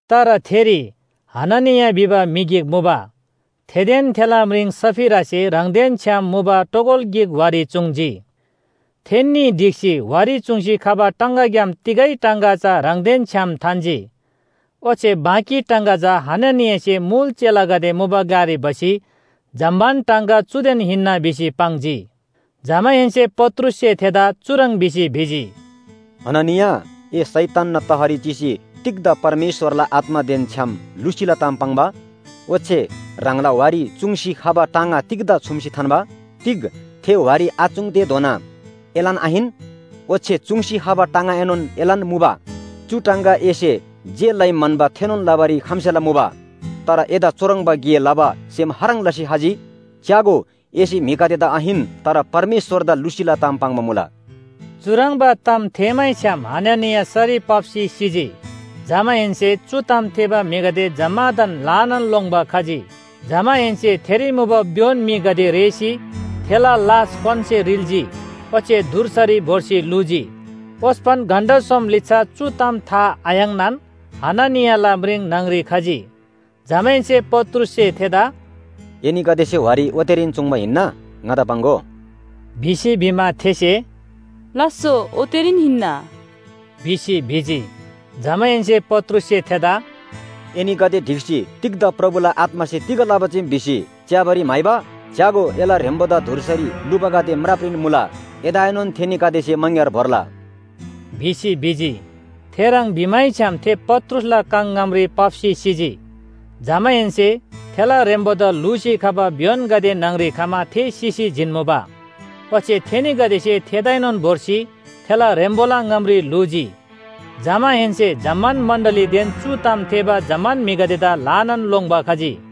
तर थेरी हननिया भिबा म्‍हि गिक मुबा, थेदेन थेला म्रिङ सफीरासे ह्राङदेन छ्‌याम मुबा टोगल गिक वारी चूङ्‌जी। थेन्‍नी ढिक्‍सी वारी चूङ्सी खबा टाङगाग्‍याम तिगै टाङगा चा ह्राङदेन छ्‌याम थान्‍जी। ओच्‍छे बाँकी टाङगा चा हननियासे मुल चेलागदे मुबा ग्‍लारी भसी जम्‍मान टाङगा चुदेन हिन्‍ना भिसी पाङ्जी। जमाहेन्‍से पत्रुससे थेदा चुह्रङ् भिसी भिजी, “हननिया ए शैतानना तहरी चिसी तिग्‍दा परमेश्‍वरला आत्‍मादेन छ्‌याम लुसीला ताम पाङ्बा? ओच्‍छे ह्राङला वारी चूङ्सी खबा टाङगा तिग्‍दा छुम्‍सी थान्‍बा? तिग थे वारी आचूङ्‌तेधोना एलान आहिन? ओच्‍छे चूङ्सी खबा टाङगाएनोन एलान मुबा, चु टाङगा एसे जे लइ म्‍हन्‍बा थेनोन लबारी खम्‍सेला मुबा। तर एदा चुह्रङ्बा गे लबा सेम खाह्रङ् लसी खजी? च्‍यागो, एसे म्‍हिगदेदा आहिन, तर परमेश्‍वरदा लुसीला ताम पाङ्बा मुला। चुह्रङ्बा ताम थेःमैछ्‌याम हननिया सरी पाप्‍सी सिजी। जमाहेन्‍से चु ताम थेःबा म्‍हिगदे जम्‍मादान ल्‍हानान लोङ्‌बा खजी। जमाहेन्‍से थेरी मुबा भ्‍योन म्‍हिगदे रेःसी थेला लास क्‍वानसे रिल्‍जी ओच्‍छे धुर्सारी भोर्सी ल्‍हुजी। ओस्‍पन घण्‍टा सोम लिच्‍छा चु ताम था आयाङ्‌नान हननियाला म्रिङ न्‍हङरी खजी। जमाहेन्‍से पत्रुससे थेदा “एनीगदेसे वारी ओतेरीन चूङ्बा हिन्‍ना? ङादा पाङ्‍गो” भिसी भिमा, थेसे “लास्‍सो, ओतेरीन हिन्‍ना” भिसी भिजी। जमाहेन्‍से पत्रुससे थेदा “एनीगदे ढिक्‍सी तिग्‍दा प्रभुला आत्‍मासे तिग लबा चीम भिसी च्‍याबारी म्‍हाइबा? च्‍यागो, एला ह्रेम्‍बोदा धुर्सारी ल्‍हुबागदे म्रापरीन मुला, एदाएनोन थेनीगदेसे मङग्‍यार भोर्ला” भिसी भिजी। थेह्रङ् भिमैछ्‌याम थे पत्रुसला काङ ङामरी पाप्‍सी सिजी। जमाहेन्‍से थेला ह्रेम्‍बोदा ल्‍हुसी खबा भ्‍योनगदे न्‍हङरी खमा थे सिसी जिन्‍मुबा, ओच्‍छे थेनीगदेसे थेदाएनोन भोर्सी थेला ह्रेम्‍बोला ङामरी ल्‍हुजी। जमाहेन्‍से जम्‍मान मण्‍डलीदेन चु ताम थेःबा जम्‍मान म्‍हिगदेदा ल्‍हानान लोङ्‌बा खजी।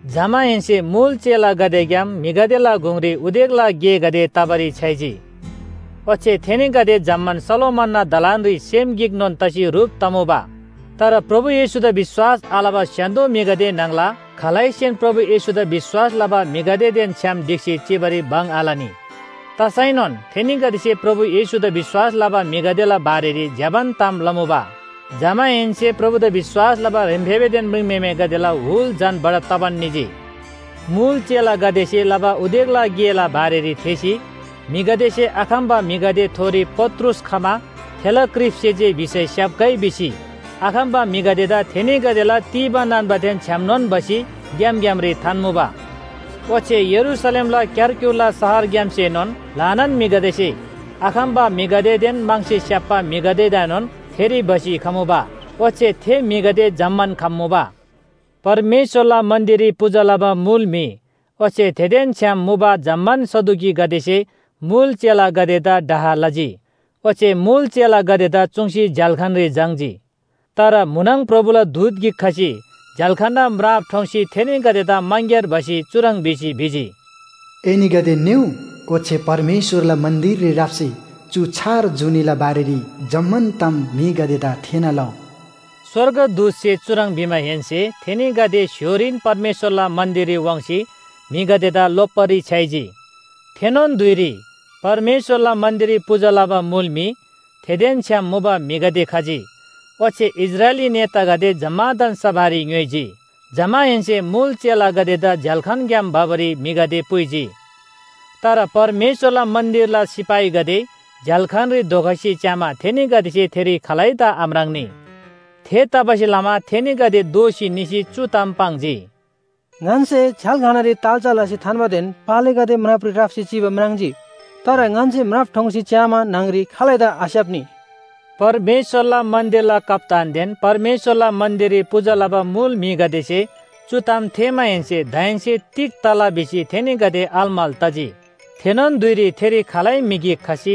जमाहेन्‍से मुल चेलागदेग्‍याम म्‍हिगदेला गुङरी उदेकला गेगदे तबारी छ्‌याइजी, ओच्‍छे थेनीगदे जम्‍मान सोलोमनना दलानरी सेम गिकनोन तसी ह्रुप तमुबा। तर प्रभु येशूदा विश्‍वास आलबा स्‍य्‍हान्‍दो म्‍हिगदे न्‍हङला खालैसेनोन प्रभु येशूदा विश्‍वास लबा म्‍हिगदेदेन छ्‌याम ढिक्‍सी चिबारी भङ आलनी, तसैनोन थेनीगदेसे प्रभु येशूदा विश्‍वास लबा म्‍हिगदेला बारेरी ज्‍यबान ताम लमुबा। जमाहेन्‍से प्रभुदा विश्‍वास लबा ह्रेम्‍फेबेदेन म्रिङम्‍हेमेगदेला हुल झन बढब तबान निजी। मुल चेलागदेसे लबा उदेकला गेला बारेरी थेःसी म्‍हिगदेसे आखम्‍बा म्‍हिगदेथोरी पत्रुस खमा थेला क्रिपसे जे भिसै स्‍याप्‍गै भिसी आखम्‍बा म्‍हिगदेदा थेनीगदेला तीबा नान्‍बादेन छ्‌यामनोन भसी ग्‍याम ग्‍यामरी थान्‍मुबा। ओच्‍छे यरूशलेमला क्‍यारक्‍युरला शहरग्‍यामसेनोन ल्‍हानान म्‍हिगदेसे आखम्‍बा म्‍हिगदेदेन म्‍हङसे स्‍याप्‍बा म्‍हिगदेदाएनोन थेरी भसी खमुबा। ओच्‍छे थे म्‍हिगदे जम्‍मान खम्‍मुबा। परमेश्‍वरला मन्‍दिररी पूजा लबा मुल म्‍हि ओच्‍छे थेदेन छ्‌याम मुबा जम्‍मान सदुकीगदेसे मुल चेलागदेदा डाह लजी। ओच्‍छे मुल चेलागदेदा चुङ्सी झ्‍याल्‍खानरी झाङ्‌जी। तर म्‍हुनङ प्रभुला दूत गिक खसी झ्‍याल्‍खानना म्राप ठोङ्सी थेनीगदेदा मङग्‍यार भसी चुह्रङ् भिसी भिजी, “एनीगदे निउ ओच्‍छे परमेश्‍वरला मन्‍दिररी राप्‍सी चु छार जुनीला बारेरी जम्‍मान ताम म्‍हिगदेदा थेःना लउ।” स्‍वर्गदूतसे चुह्रङ् भिमाहेन्‍से थेनीगदे स्‍य्‍होरीन परमेश्‍वरला मन्‍दिररी वाङ्सी म्‍हिगदेदा लोप्‍बारी छ्‌याइजी। थेनोन धुइरी परमेश्‍वरला मन्‍दिररी पूजा लबा मुल म्‍हि, थेदेन छ्‌याम मुबा म्‍हिगदे खजी, ओच्‍छे इस्राएली नेतागदे जम्‍मादान सभारी ङ्‌योइजी। जमाहेन्‍से मुल चेलागदेदा झ्‍याल्‍खानग्‍याम भबारी म्‍हिगदे पुइजी। तर परमेश्‍वरला मन्‍दिरला सिपाहीगदे झ्‍याल्‍खानरी धोखसी च्‍यामा थेनीगदेसे थेरी खालैदा आम्राङ्‌नी। थेतबासेलमा थेनीगदे दोःसी निसी चु ताम पाङ्जी। “ङन्‍से झ्‍याल्‍खानरी ताल्‍चा लसी थान्‍बादेन पालेगदे म्रापरी राप्‍सी चिबा म्राङ्जी, तर ङन्‍से म्राप ठोङ्सी च्‍यामा न्‍हङरी खालैदा आस्‍याप्‍नी।” परमेश्‍वरला मन्‍दिरला कप्‍तानदेन परमेश्‍वरला मन्‍दिररी पूजा लबा मुल म्‍हिगदेसे चु ताम थेःमाहेन्‍से दाहेन्‍से तिग तला भिसी थेनीगदे अलमल तजी। थेनोन धुइरी थेरी खालै म्‍हि गिक खसी,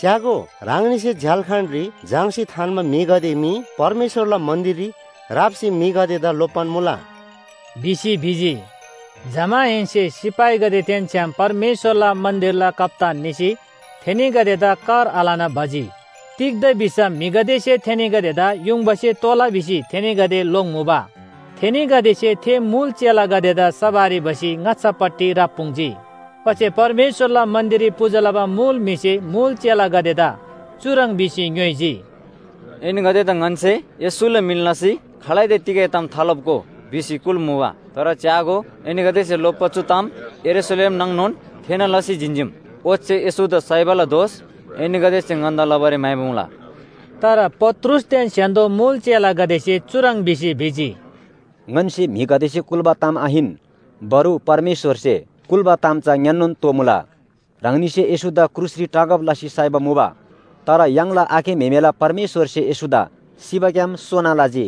“च्‍यागो, ह्राङनीसे झ्‍याल्‍खानरी झाङ्‌सी थान्‍बा म्‍हिगदे मी परमेश्‍वरला मन्‍दिररी राप्‍सी म्‍हिगदेदा लोप्‍बान मुला” भिसी भिजी। जमाहेन्‍से सिपाहीगदेदेन छ्‌याम परमेश्‍वरला मन्‍दिरला कप्‍तान निसी थेनीगदेदा कर आलना भजी। तिग्‍दा भिसम म्‍हिगदेसे थेनीगदेदा युङबासे तोला भिसी थेनीगदे लोङ्‌मुबा। थेनीगदेसे थे मुल चेलागदेदा सभारी भसी ङाच्‍छापट्टि राप्‍पुङ्जी। ओच्‍छे परमेश्‍वरला मन्‍दिररी पूजा लबा मुल म्‍हिसे मुल चेलागदेदा चुह्रङ् भिसी ङ्‌योइजी, “एनीगदेदा ङन्‍से येशूला मिन लसी खालैदा तिगै ताम थालोप्‍गो भिसी कुल्‍मुबा। तर च्‍यागो, एनीगदेसे लोप्‍बा चु ताम यरूशलेम नाङनोन थेःना लसी जिन्‍जीम, ओच्‍छे येशूदा साइबाला दोष एनीगदेसे ङन्‍दा लबारी म्‍हाइबा मुला।” तर पत्रुसदेन स्‍य्‍हान्‍दो मुल चेलागदेसे चुह्रङ् भिसी भिजी, “ङन्‍से म्‍हिगदेसे कुल्‍बा ताम आहिन, बरु परमेश्‍वरसे कुल्‍बा ताम चा ङ्‌यान्‍नोन तोःमुला। ह्राङनीसे येशूदा क्रुसरी टाँगब लसी साइबा मुबा, तर य्‍हाङला आखे म्‍हेमेला परमेश्‍वरसे येशूदा सिबाग्‍याम सोना लजी।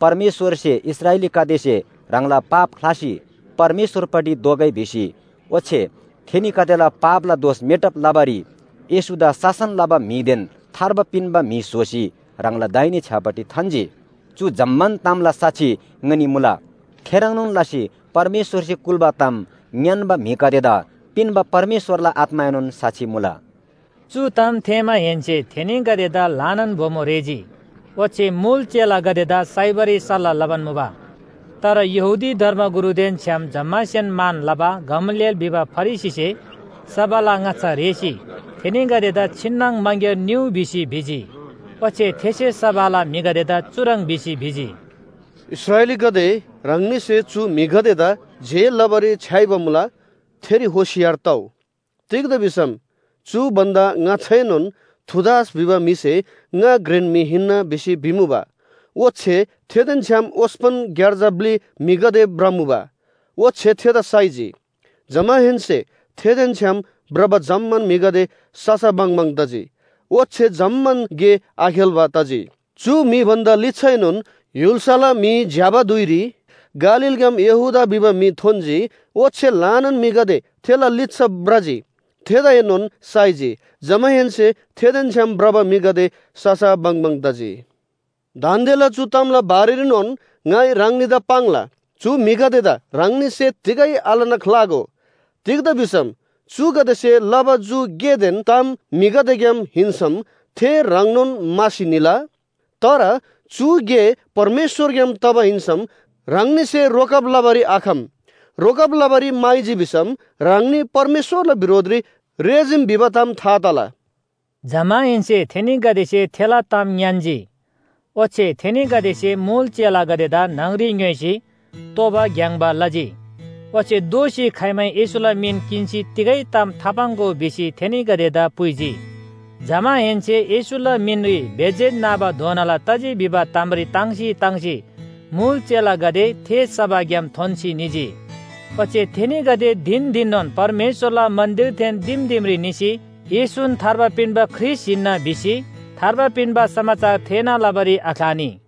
परमेश्‍वरसे इस्राएलीगदेसे ह्राङला पाप ख्‍लासी परमेश्‍वरपट्टि दोःगै भिसी ओच्‍छे थेनीगदेला पापला दोष मेटब लबारी येशूदा शासन लबा म्‍हिदेन थार्बा पिन्‍बा म्‍हि स्‍होसी ह्राङला दाहिने छ्‌यापट्टि थान्‍जी। चु जम्‍मान तामला साक्षी ङनी मुला, थेह्रङ्नोन लसी परमेश्‍वरसे कुल्‍बा ताम ङ्‌यान्‍बा म्‍हिगदेदा पिन्‍बा परमेश्‍वरला आत्‍माएनोन साक्षी मुला।” चु ताम थेःमाहेन्‍से थेनीगदेदा ल्‍हानान बोमो रेःजी, ओच्‍छे मुल चेलागदेदा साइबारी सल्‍लाह लबान मुबा। तर यहूदी धर्मगुरुदेन छ्‌याम जम्‍मासेन मान लबा गमलिएल भिबा फरिसीसे सभाला ङाच्‍छा रेःसी थेनीगदेदा छिन्‍नङ मङग्‍यार निउ भिसी भिजी। ओच्‍छे थेसे सभाला म्‍हिगदेदा चुह्रङ् भिसी भिजी, “इस्राएलीगदे ह्राङनीसे चु म्‍हिगदेदा जे लबारी छ्‌याइबा मुला, थेरी होशियार तउ। तिग्‍दा भिसम चु भन्‍दा ङाच्‍छाएनोन थूदास भिबा म्‍हिसे ङा घ्रेन म्‍हि हिन्‍ना भिसी भिमुबा। ओच्‍छे थेदेन छ्‌याम ओस्‍पन ग्‍यार्जा ब्‍लि म्‍हिगदे भ्रमुबा, ओच्‍छे थेदा साइजी। जमाहेन्‍से थेदेन छ्‌याम भ्रबा जम्‍मान म्‍हिगदे ससा बङबङ तजी, ओच्‍छे जम्‍मान गे आखेल्‍बा तजी। चु म्‍हि भन्‍दा लिच्‍छाएनोन य्‍हुल्‍साला म्‍हि झ्‍याबा धुइरी गालीलग्‍याम यहूदा भिबा म्‍हि थोन्‍जी, ओच्‍छे ल्‍हानान म्‍हिगदे थेला लिच्‍छा भ्रजी, थेदाएनोन साइजी। जमाहेन्‍से थेदेन छ्‌याम भ्रबा म्‍हिगदे ससा बङबङ तजी। दान्‍देला चु तामला बारेरीनोन ङाइ ह्राङनीदा पाङ्ला, चु म्‍हिगदेदा ह्राङनीसे तिगै आलना ख्‍लागो। तिग्‍दा भिसम चुगदेसे लबा चु गेदेन ताम म्‍हिगदेग्‍याम हिन्‍सम थे ह्रङ्नोन म्‍हासी निला। तर चु गे परमेश्‍वरग्‍याम तबा हिन्‍सम ह्राङनीसे रोकब लबारी आखम। रोकब लबारी म्‍हाइजी भिसम ह्राङनी परमेश्‍वरला बिरोधरी रेःजीम भिबा ताम था तला।” जमाहेन्‍से थेनीगदेसे थेला ताम ङ्‌यान्‍जी। ओच्‍छे थेनीगदेसे मुल चेलागदेदा न्‍हङरी ङ्‌योइसी तोबा ग्‍याङ्‍बा लजी। ओच्‍छे “दोःसी खाइमै येशूला मिन किन्‍सी तिगै ताम थापाङ्‍गो” भिसी थेनीगदेदा पुइजी। जमाहेन्‍से येशूला मिनरी बेइज्‍जत नाबाधोनाला तजी भिबा तामरी ताङ्सी ताङ्सी मुल चेलागदे थे सभाग्‍याम थोन्‍सी निजी। ओच्‍छे थेनीगदे धिन धिननोन परमेश्‍वरला मन्‍दिरदेन दिम दिमरी निसी येशून थार्बा पिन्‍बा ख्रीष्‍ट हिन्‍ना भिसी थार्बा पिन्‍बा समाचार थेःना लबारी आख्‍लानी।